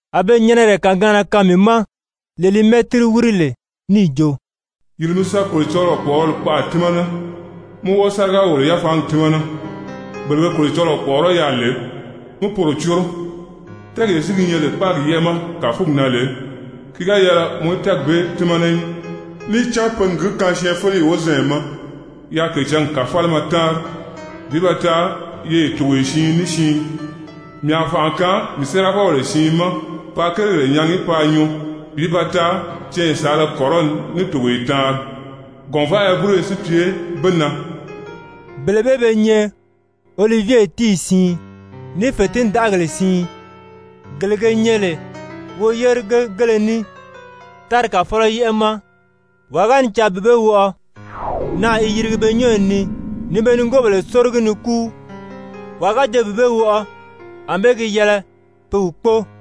A be nyɛnɛrɛ kàgaanna kaan mii ma lee li mɛ́tiri wíri lè, níì jo: «Yìri mi sa Kolocɔlɔɔ kpɔ̀ʔɔrɔli kpaʔa tímana, mi wɔ́ɔ sáriga-wòlo-yafaangi tímana, bele be Kolocɔlɔɔ kpɔ̀ʔɔrɔ́ yaà lè, mí poro córo. Tɛ́ɛgee si gi nyɛ lè kpáagi yɛ́ʔɛ ma kàfugi na lè, ki ga yɛlɛ mɔ í tɛ́ɛgi bee tímana í, níì cán pe n gi kaan syɛɛnfeleyi wozanya ma yaa kècǎngi kàfalima táanri bi ba taa yeye togoye siin ní siin. Mii a fànʔa kaan mii séerafɔbèle siin ma paa kérigèle nyaagi paa nyuu bi ba taa canya saala kɔrɔni ní togoye taanri, gɔ̀nvaʔaya búroyo si pye be na.» Bele bee be nyɛ olivye tíiyi siin, ní fètindaʔagèle siin, gele ge nyɛ lè woyérigegéle ní tári Kàfɔlɔ yɛ́ʔɛ ma. Waa ga ni caa bi be wɔʔɔ, naà i yirigi pe nyɔ́ɔyi ni ni be nigoobèle sórogi ni kúu. Wàa ga jo bi be wɔʔɔ, ànbée gi yɛlɛ pe wi kpóo.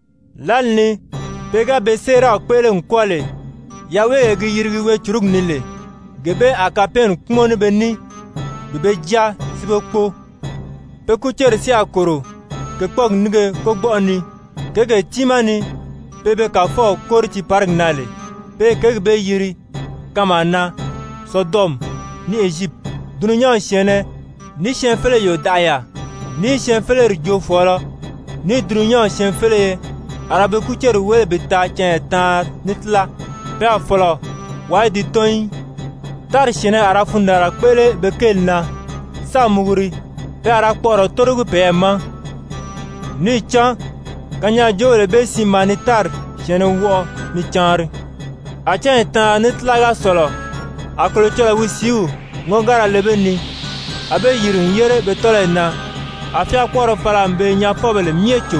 Lǎli ni pe ga be séeraw kpéʔele n kwɔ́ɔ lè, yaweegee gi yirigi weecurugi ni lè, gee bee a kapɛɛnni kpúmɔn ní be ní bi be jáa si be kpóo. Pe kúceri si a kòro kèkpɔɔgi nínge kógbɔʔɔ ni, kěgee tiimaa ni pe be Kàfɔw kóri tiiparigi na lè. Pe i kěgi bee yiri kanmaa na Sodɔmi ní Ezyipiti. Dulunyanw syɛ̀ɛnnɛ, ní syɛɛnfeleyi yòdaʔaya, ní syɛɛnfeleri joofɔɔlɔ, ní dulunyanw syɛɛnfeleye a ra pe kúceri wéle bi taa canya taanri ní tíla, pe a fɔ̀lɔ wàa í di tɔ́n í. Tári syɛ̀ɛnnɛ a ra fundaanra kpéʔele be kéeli na, sáā muguri. Pe a ra kpɔʔɔrɔ tórogi peyɛɛ ma, níì cán kanyaajoobèle bee siin maa ni tári syɛ̀ɛnnɛ wɔʔɔ ni caanri. A cányi taanri ní tíla ga sɔ̀lɔ, a Kolocɔlɔɔ wi sìíw ŋɔ́ngara le be ni, a be yìri n yére be tɔ́lɔyi na. A fyáakpɔɔrɔ fala n be nyaafɔbèle myɛ cò.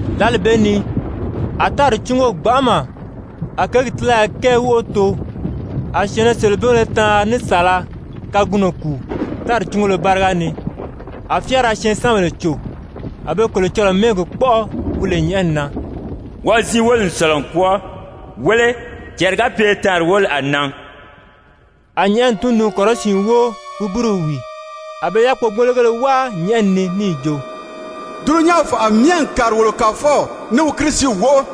Lǎli bee ni a tári cúngo gbanʔama, a kěgi tílaya kɛɛ wóʔo too. A syɛ̀ɛnnɛ selebingéle taanri ní saala kagunɔ kùu tári cúngolo báriga ni, a fyáara syɛɛnsanbèle cò, a be Kolocɔlɔɔ mɛ́ɛgi kpɔ́ʔɔ wi lè nyɛ̀ʔɛni na. Wɔʔɔ ziin wóli n sɔ̀lɔ n kwɔ́ɔ. Wéle, cɛɛri ga pye taanri wóli a nan. A nyɛ̀ʔɛni tundun-kɔrɔsiin wóo wi búruw wìi. A be yákpogbologéle wáa nyɛ̀ʔɛni ni níì jo: «Dulunyanw fànʔa myɛ n kàri wolo Kàfɔw ní wi Kirisiw wóʔo.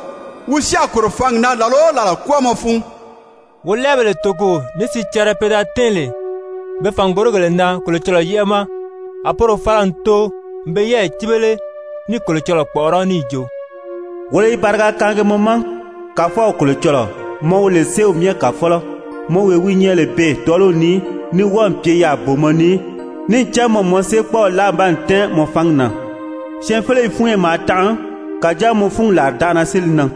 Wi si a kòro fǎngi na làla o làla kwɔ́ɔmɔ fun!» Wolɛɛbèle toko ní sicɛrɛ pe da tɛ́ɛn lè be fàngorigèle na Kolocɔlɔɔ yɛ́ʔɛ ma, a poro fala n too n be yɛ́ɛyi cíbele ní i Kolocɔlɔɔ kpɔ̀ʔɔrɔ́ níì jo: «Wolo i bariga kaangi mɔ ma, Kàfɔw Kolocɔlɔɔ, mɔ wi lè Séew Myɛ Kàfɔlɔ, mɔ wee wi nyɛ lè beè tɔ́ɔliw ni, ní wɔ́ɔ̀ pye yaà booma ni, níì cán mɔ n mɔ séekpɔɔw láa n baa tɛ́ɛn mɔ fangi na. Syɛɛnfeleyi fúnyo maa tanʔa, kàjáa mɔ fúngi làridanʔana si li nan,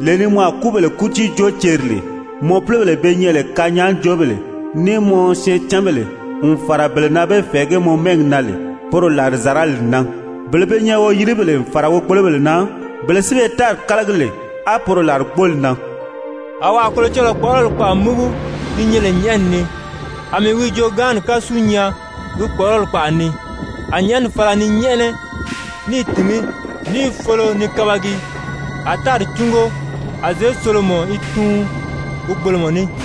lee ni mɔ a kúbèle kútii joo ceri lè, mɔ púlobèle be nyɛ lè kanyaajoobèle, ní mɔ syɛɛncanbèle, n fàra bele na be fɛ̀ɛgí mɔ mɛ́ɛgi na lè, poro làrizarali n nan, bele be nyɛ lè woyilibèle n fàra wogbolobèle na, bele si be tári kálagi lè, á poro làrigbooli nan.» A wàa Kolocɔlɔɔ kpɔ̀ʔɔrɔli kpaʔa múgu gi nyɛ lè nyɛ̀ʔɛni ni, a mii wi joogaanni kásu nyaa wi kpɔ̀ʔɔrɔli kpaʔa ni. A nyɛ̀ʔɛni fala ni nyɛ́ʔɛnɛ, ní i tìngí, ní i folo ni kabagi, a tári cúngo, a zěsolomɔ i tuun wogbolomɔ ní.